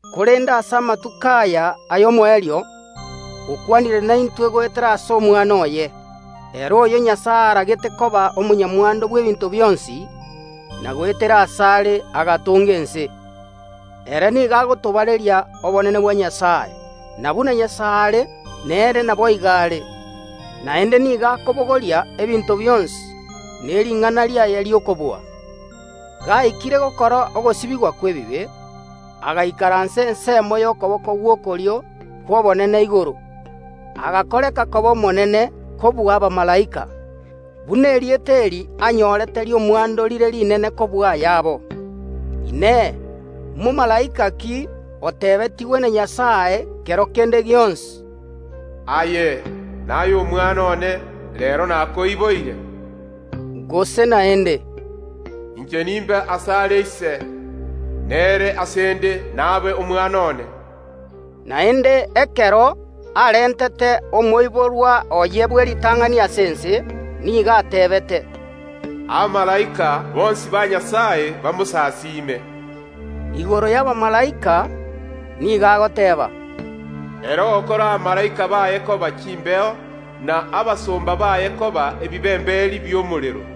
korende ase amatuko aya y’omoerio okwanire naintwe goetera ase Omwana oye. Ere oyo Nyasae aragete koba omonyamwando bw’ebinto bionsi, na goetera asare agatonga ense. Ere nigo agotobareria obonene bwa Nyasae, na buna Nyasae are, nere naboigo are, naende nigo akobogoria ebinto bionsi ne ring’ana riaye ri’okobua. Gaikire gokora ogosibigwa kw’ebibe, agaikaransa ensemo y’okoboko gw’okorio kw’Obonene igoro. Omwana agakorwa koba omonene kobua abamalaika, buna erieta eri anyorete ri’omwando rire rinene kobua ayabo. Ekiagera Nyasae tatebetie momalaika onde bwensi, “Aye, naye Omwana one, reero nakoiboire”? Gose naende, “Inche nimbe asare ise, nere ase ’nde nabe Omwana one”? Korende ekero Nyasae arenge ange gotoma Omwana oye omotangi gocha ase ense, nigo atebete: “Abamalaika bonsi ba Nyasae goika bamosasime.” Korende igoro y’abamalaika Nyasae nigo agoteeba, “Nyasae nigo agokora Abamalaika baye koba chimbeo, na abasomba baye koba ebibemberi b’omorero.”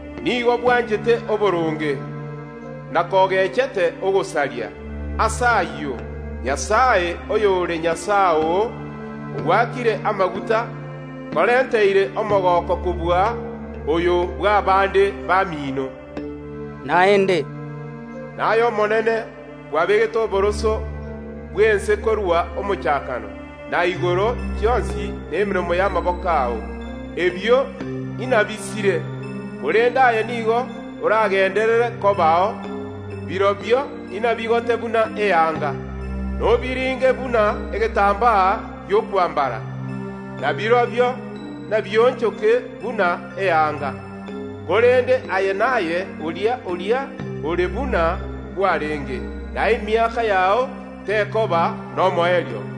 Nigo bwanchete oboronge, na kogechete ogosaria; ase ayio, Nyasae, oyore Nyasae oo, ogoakire amaguta, okorenteire omogooko kobua oyo bw’abande bamino.” Naende agateeba. “Naye Omonene, kwabegete oboroso bw’ense korwa omochakano, na igoro chionsi nemeremo y’amaboko ao. Ebio inabisire, korende aye nigo oragenderere kobao, birobio inabigote buna chianga, nobiringe buna egetambaa gi’okwambara, na birobio nabionchoke buna chianga. Korende aye naye oria oria ore buna kwarenge, na obogima bwao tibokoba nomoerio.”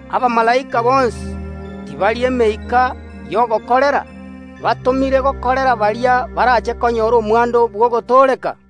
Abamalaika ngento ki gotatiga emeika y’ogokorera Nyasae, batomire gokorera baria barache konyora omwando bw’ogotooreka?